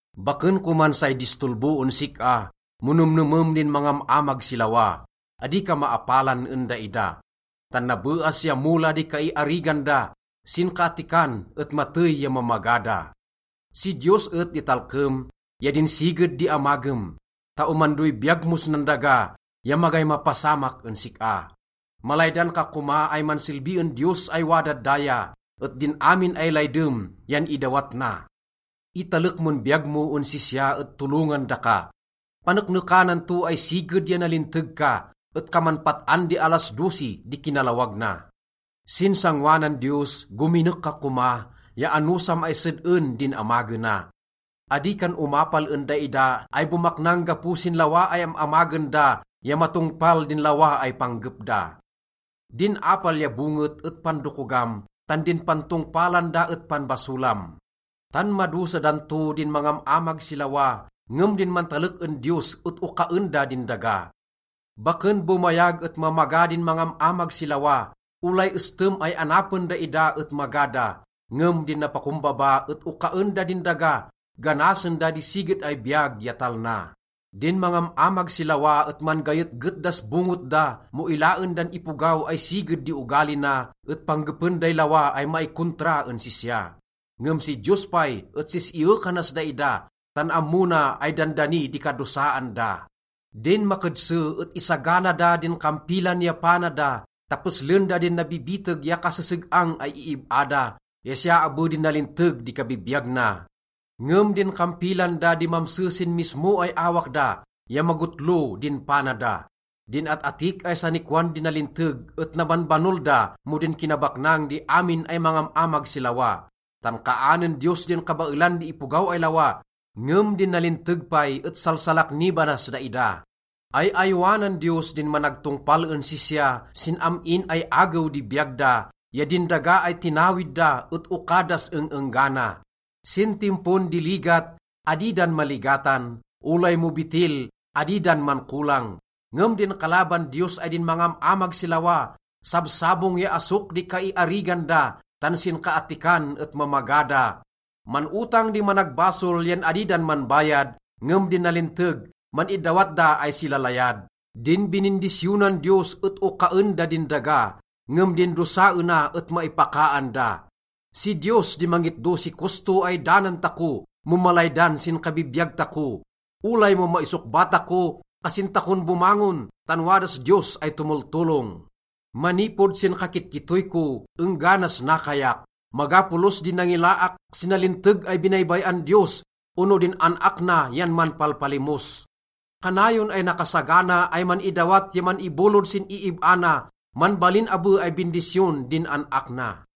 Baken koman say distolbo en sik-a mo nemnemem din mangam-amag si lawa. Adi ka maapalan en daida. Tan nabeas ya mola di kaiarigan da, sinkaattikan et matey ya mamaga da. Si Diyos et di talkem ya din siged di amagem, ta omandoy biyag mos nan daga ya magay mapasamak en sik-a. Malaydan ka koma ay mansilbi en Diyos ay wadad daya, et din amin ay laydem yan idawat na. Italek mon biyag mo en sisya et tolongan daka. Paneknekanan to ay siged ya nalinteg ka, et kaman pat-an di alas dosi di kinalawag na. Sin sangoanan Diyos, gominek ka koma ya anosam ay sed-en din amagena. Adi kan omapal en daida ay bomaknang gapo sin lawa ay am-amagen da ya matongpal din lawa ay panggep da. Din apal ya bonget et pandokogam, tan din pantongpalan da et panbasolam. Tan madosa dan to din mangam-amag si lawa, ngem din mantalek en Diyos et okaen da din daga. Baken bomayag et mamaga din mangam-amag si lawa, olay estem ay anapen daida et maga da. Ngem din napakombaba et okaen da din daga, ganasen da di siged ay biyag ya talna. Din mangam-amag si lawa et man-gayetget das bonget da mo ilaen dan ipogaw ay siged di ogali na, et panggepen day lawa ay maikontra en sisya. Ngem si Diyos pay et sis-iyekanas daida, tan ammo na ay dandani di kadosaan da. Din makedse et isagana da din kampilan ya pana da ta peslen da din nabibiteg ya kaseseg-ang ay iib-a da ya siya abe din nalinteg di kabibiyag na. Ngem din kampilan da di mamse sin mismo ay awak da ya magotlo din pana da. Din at-atik ay sanikwan di nalinteg et nabanbanol da mo din kinabaknang di amin ay mangam-amag si lawa. Tan kaanen Diyos din kabaelan di ipogaw ay lawa, ngem din nalinteg pay et salsalaknibanas daida. Ay-ayowanan Diyos din managtongpal en sisya sin am-in ay agew di biyag da, ya din daga ay tinawid da et oka das eng-enggana. Sin timpon di ligat, adi dan maligatan, olay mo betil, adi dan mankolang. Ngem din kalaban Diyos ay din mangam-amag si lawa, sabsabong ya asok di kaiarigan da, tan sinkaattikan et mamaga da. Man-otang di managbasol yan adi dan manbayad, ngem din nalinteg, man-idawat da ay silalayad. Din binindisyonan Diyos et okaen da din daga ngem din dosaena et maipakaan da. Si Diyos di mangitdo si kosto ay danan tako mo malaydan sin kabibiyag tako. Olay mo maisokba tako, kasin takon bomangon, tan wadas Diyos ay tomoltolong. Manipod sin kakitkittoy ko engganas nakayak, maga polos di nangilaak si nalinteg ay binaybay-an Diyos ono din an-ak na yan manpalpalimos. Kanayon ay nakasagana ay man-idawat ya man-ibolod sin iib-a na, manbalin abe ay bindisyon din an-ak na.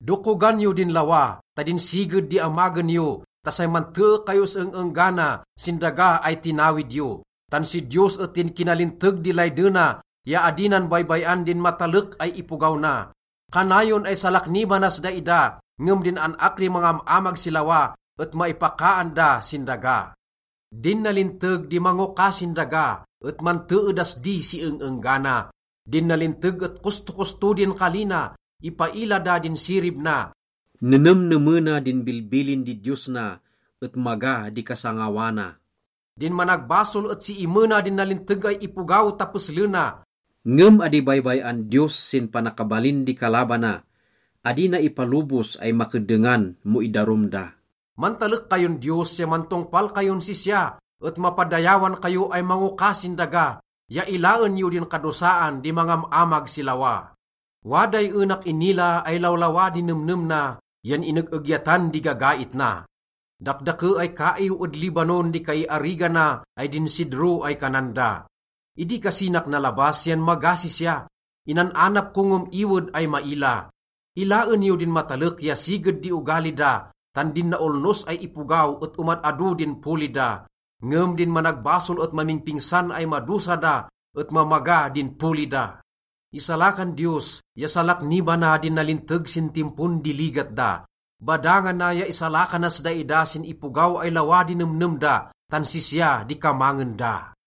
Dokogan yo din lawa ta din siged di amagen yo ta say mantee kayos eng-enggana sin daga ay tinawid yo. Tan si Diyos et din kinalinteg di laydena ya adi na baybay-an din matalek ay ipogaw na. Kanayon ay salaknibanas daida, ngem din an-ak di mangam-amag si lawa et maipakaan da sin daga. Din nalinteg di mangoka sin daga et mantee das di si eng-enggana. Din nalinteg et kostokosto din kali na, ipaila da din sirib na. Nenemnemena din bilbilin di Diyos na et maga di kasangawana. Din managbasol et siimena din nalinteg ay ipogaw ta peslena. Ngem adi baybay-an Diyos sin panakabalin di kalabana, adi na ipalobos ay makeddengan mo idarum da. Mantalek kayon Diyos ya mantongpal kayon sisya, et mapadayawan kayo ay mangoka sin daga, ya ilaen yo din kadosaan di mangam-amag si lawa. Waday enak inila ay lawlawa di nemnem na yan ineg-egyatan di gagait na. Dakdake ay kaiw ed Lebanon di kaiarigana ay din sidro ay kanan da. Idi kasinak nalabas yan maga sisya, inan-anap ko ngem iwed ay maila. Ilaen yo din matalek ya siged di ogali da, tan din naolnos ay ipogaw et omad-ado din poli da. Ngem din managbasol et mamingpingsan ay madosa da et mamaga din poli da. Isalakan Diyos ya salaknibana din nalinteg sin timpon di ligat da. Badangana ya isalakanas daida sin ipogaw ay lawa di nemnem da, tan sisya di kamangen da.